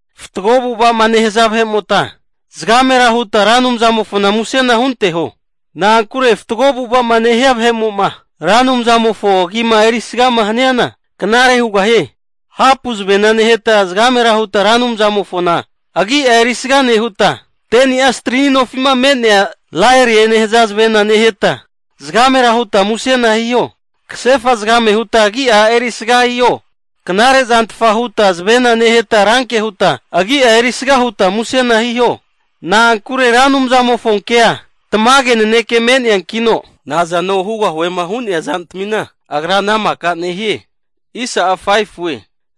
Fatgo avu'ava'ma nehaza vahe'mota zagamera huta Ra Anumzamofona musena hunteho. Na'ankure fatgo avu'ava'ma nehia vahe'mo'ma Ra Anumzamofo agima erisgama haniana knare hugahie. Hapu zavena neheta zagamera huta Ra Anumzamofona agia erisga nehuta, 10ni'a strini nofi'ma me'nea zavenagu'ma laeriema nehaza zavena neheta zagamera huta musena hiho. Kasefa zagame huta agia erisga hiho. Knarezantfa huta zavena neheta ranke huta agi'a erisga huta musena hiho. Na'ankure Ra Anumzamofonkea tamage naneke me'neankino, nazano hugahuema hu'nea zantamina Agra ana maka nehie.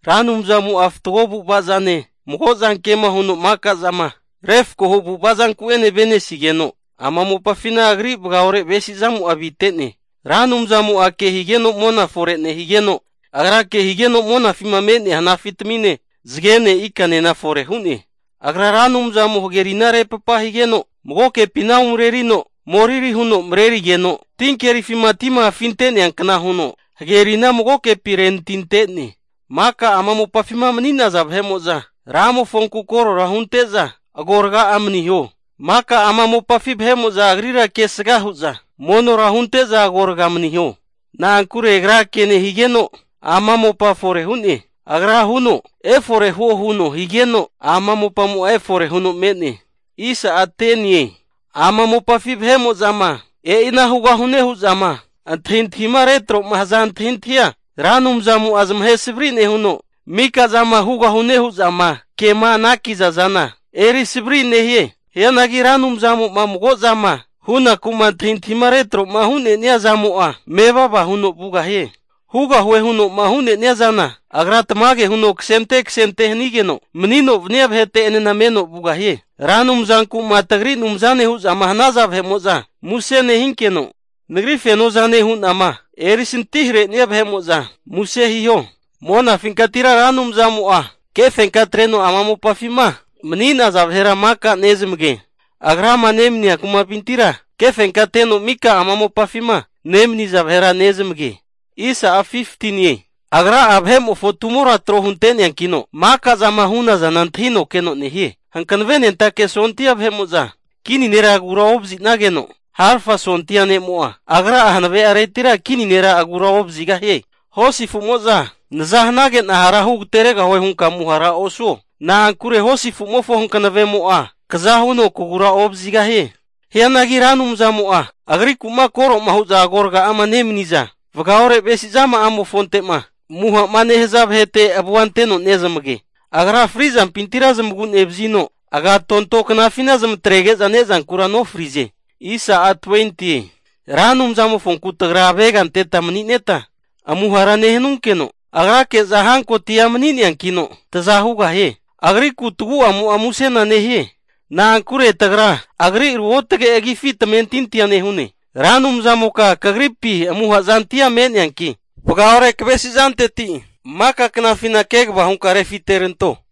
Ra Anumzamo'a fatgo avu'avazane, mago zanke'ma huno maka zama refkohu avu'ava zanku'ene avenesigeno, ama mopafina Agri vagaore avesizamo avite'ne. Ra Anumzamo'a ke higeno mona fore nehigeno, Agra ke higeno monafima me'nea hanafitamine zagene ikanena fore hu'ne. Agra, Ra Anumzamo hagerina repapa higeno magokepina umareno moriri huno marerigeno, tinkerifima tima afinteankna huno hagerina magokepi renatinte'ne. Maka ama mopafima mani'naza vahe'mo'za Ra Anumzamofonku korora hunte'za agoraga'a maniho. Maka ama mopafi vahe'mo'za Agrira kesga hu'za monora hunte'za agorga maniho. Na'ankure Agra ke nehigeno ama mopa fore hu'ne. Agra huno, efore huo huno higeno ama mopamo'a efore hu'no me'ne. Ama mopafi vahe'mo'zama e'ina hugahune hu'zama antahintahima retro'ma haza antahintahia Ra Anumzamo'a zamahe savri nehuno, mika zama hugahune hu'zama kema anakiza zana eri haviza nehie. Hianagi Ra Anumzamo'ma mago'zama hunaku'ma antahintahima retro'ma hu'nenia zamo'a mevava huno vugahie. Hugahue huno'ma hu'nenia zana Agra tamage huno fore'ma hu anante anante'ma hanigeno manino vania vahete'enena meno vugahie. Ra Anumzanku'ma tagri Anumzane hu'zama hanaza vahe'mo'za muse nehinkeno, Nagri fenozane huno'ma eri santimahare'nea vahe'mo'za muse hiho. Monafinkatira Ra Anumzamo'a kefenka atreno ama mopafima mani'naza vahera maka nezamagie Agrama nemania kumapintira kefenka ateno mika ama mopafima nemaniza vahera nezamage. Agra vahe'mofo tumora trohunte'neankino, maka zama hu'na zana antahino keno nehie. Hankavenentake sondia vahetmimo'za kini nera agura ovazi'nageno, harafa sondia ne'mo'a agra'a hanave'aretira kini nera agura ovazigahie Hosi afu'mo'za naza hanage'na hara agateregahue hunka amuhara osuo. Na'ankure hosi afu'mofo hankavemo'a kaza huno kagura ovazigahie. Hianagi Ra Anumzamo'a Agriku'ma koro'ma hu'za agoraga'ama nemani'za, vagaore avesizama'mofonte'ma amuha'ma nehaza vahete avua anteno nege. Agra frizampintira zamagu'nevazino agatonto knafina zamatrege'za ne'zankura nofrize. Ra Anumzamofonku tagra avega anteta manineta amuhara nehunankino, Agrake'za hankotia mani'neankino, taza hugahie. Agriku tagu'amo'a musena nehie, na'ankure tagra, Agri ruotge agifi tamentintia nehune. Ra Anumzamoka kagripi amuha zantia me'neanki, vagaore kavesi'zanteti maka knafina kegava hunka refiteranto.